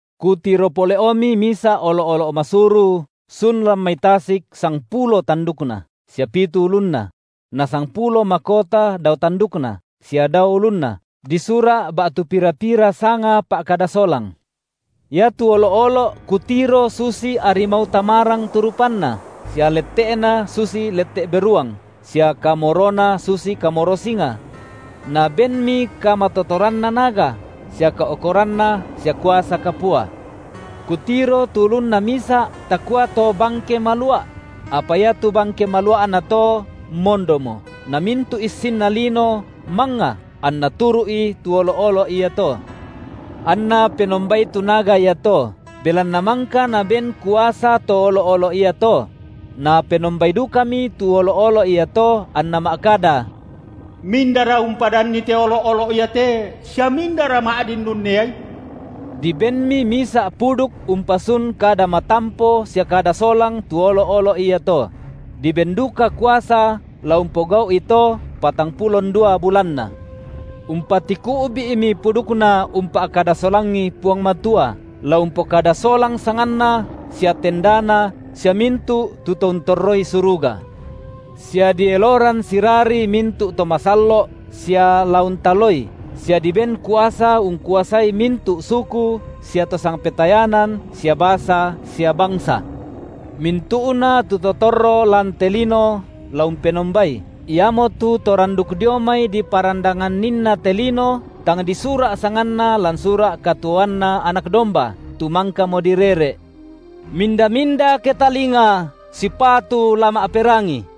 Kutiro pole’omi misa’ olo’-olo’ masuru sun lan mai tasik sangpulo tandukna, sia pitu ulunna; na sangpulo makota dao tandukna, sia dao ulunna, disura’ ba’tu pira-pira sanga pa’kada solang. Iatu olo’-olo’ kutiro susi arimau tamarang tu rupanna, sia lette’na susi lette’ beruang, sia kamorona susi kamoro singa. Nabenmi kamatotoranna naga, sia kao’koranna sia kuasa kapua. Kutiro tu ulunna misa’ takua to bangke malua’; apa iatu bangke malua’na to mondomo, namintu’ issinna lino mangnga anna turu’i tu olo’-olo’ iato. Anna penombai tu naga iato, belanna mangka naben kuasa to olo’-olo’ iato; napenombai dukami tu olo’-olo’ iato anna ma’kada: Mindara umpadanni te olo’-olo’ iate sia mindara ma’din unneai? Dibenmi misa’ puduk umpasun kada matampo sia kada solang tu olo’-olo’ iato; diben duka kuasa la umpogau’i to patangpulo ndua bulanna. Umpatiku’bi’mi pudukna umpa’kada solangi Puang Matua, la umpokada solang sanganNa sia tendaNa sia mintu’ tu to untorroi suruga. Sia dieloran sirari mintu’ to masallo’ sia la untaloi, sia diben kuasa ungkuasai mintu’ suku sia to sangpetayanan sia basa sia bangsa. Mintu’na tu to torro lan te lino la umpenombai, iamotu to randuk dio mai diparandanganninna te lino, tang disura’ sanganna lan sura’ katuoanNa Anak domba, tu mangkamo direre’. Minda-minda ketalinga, sipatu la ma’perangi.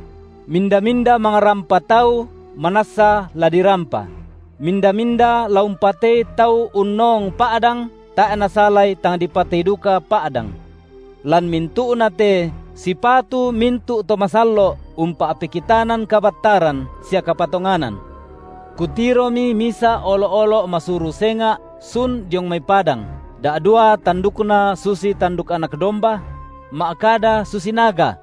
Minda-minda mangrampa tau, manassa la dirampa; minda-minda la umpatei tau unnoong pa’dang, tae’ nasalai tang dipatei duka pa’dang. Lan mintu’na te sipatu mintu’ to masallo’ umpa’pekitanan kabattaran sia kapatonganan. Kutiromi misa’ olo’-olo’ masuru senga’ sun diong mai padang, da’dua tandukna susi tanduk Anak domba; ma’kada susi naga.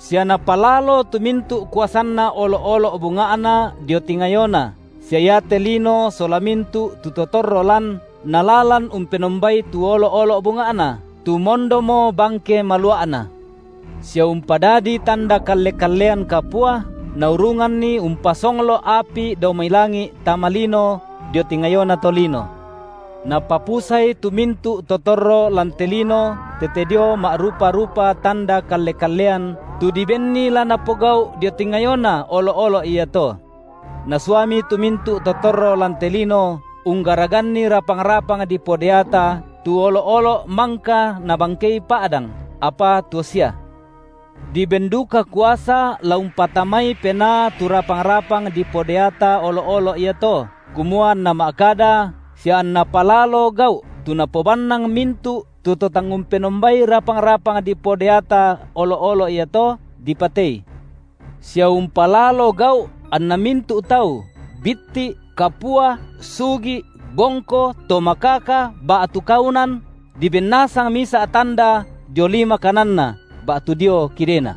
Sia napalalo tu mintu’ kuasanna olo’-olo’ bunga’na dio tingayona, sia iate lino sola mintu’ tu to torro lan nalalan umpenombai tu olo’-olo’ bunga’na, tu mondomo bangke malua’na. Sia umpadadi tanda kalle-kallean kapua, naurunganni umpasonglo’ api dao mai langi’ tama lino dio tingayona tolino. Napapusai tu mintu’ to torro lan te lino tete dio ma’rupa-rupa tanda kalle-kallean tu dibenni la napogau’ dio tingayona olo’-olo’ iato. Nasuami tu mintu’ to torro lan te lino unggaraganni rapang-rapang dipodeata tu olo’-olo’ mangka nabangkei pa’dang, apa tuo sia. Diben duka kuasa la umpatamai penaa tu rapang-rapang dipodeata olo’-olo’ iato, kumua anna ma’kada, sia anna palalo gau’, tu napobannang mintu’ tu to tang umpenombai rapang-rapang dipodeata olo’-olo’ iato, dipatei. Sia umpalalo gau’ anna mintu’ tau, bitti’, kapua, sugi’, bongko, to makaka, ba’tu kaunan, diben nasang misa’ tanda dio lima kananna ba’tu dio kidena;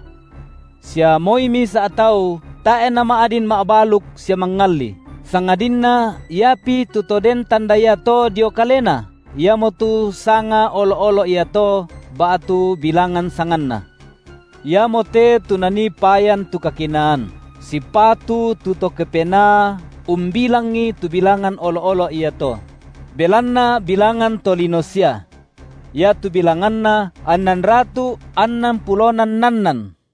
sia moi misa’ tau tae’ nama’din ma’baluk sia mangalli, sangadinna iapi tu to den tanda iato dio kalena, iamotu sanga olo’-olo’ iato ba’tu bilangan sanganna. Iamote tu nanii payan tu kakinaan. Sipatu tu to kepenaa umbilangi tu bilangan olo’-olo’ iato; belanna bilangan tolino sia. Iatu bilanganna annanratu’ annan pulona nnannan.